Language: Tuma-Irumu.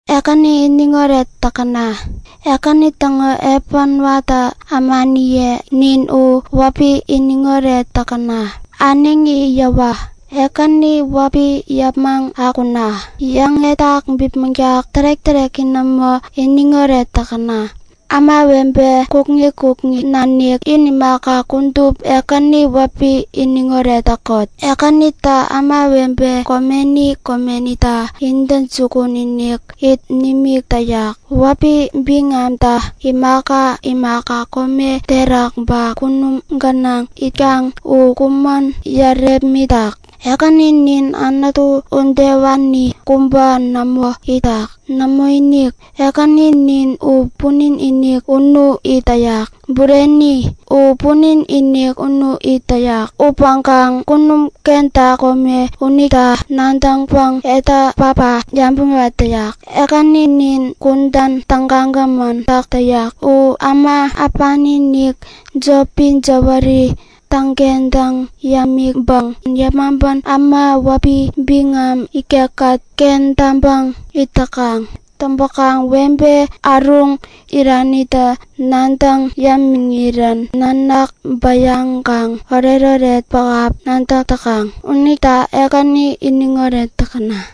Ekäni iniŋoret täkäna! Ekäni täŋo epän watä ämaniye nin u wäpi iniŋoret täkäna! Äneŋi yäwa! Ekäni wäpi yäpmäŋ akuna! Yäŋetak bipmäŋtak tärek-täreki nämo iniŋoret täkäna! Ämawebe kukŋi kukŋi nanik in imaka, kudup Ekäni wäpi iniŋoret täkot! Ekänitä ämawebe komeni komenita intäjukun-inik it nimik täyak. Wäpi biŋamtä imaka imaka kome terak ba kunum gänaŋ itkaŋ u kumän yärepmitak. Ekäninin Anutu udewani kubä nämo itak! Nämoinik, Ekäninin u punin-inik unu it täyak. Bureni, u punin-inik unu it täyak upäŋkaŋ kunum kenta kome unita nadäŋpäŋ etä päpä yabäŋ yäwat täyak. Ekäninin kudän tägagämän täk täyak. U äma äpani-inik, jopi jäwäri täŋkentäŋ yämiŋpäŋ yepmaŋpän äma wäpi biŋam ikekkät kentäŋpäŋ it täkaŋ. Täŋpäkaŋ webe äruŋ iranita nadäŋ yämiŋirän nanak bäyaŋkaŋ oretoret pähap nadäk täkaŋ. Unita Ekäni iniŋoret täkäna!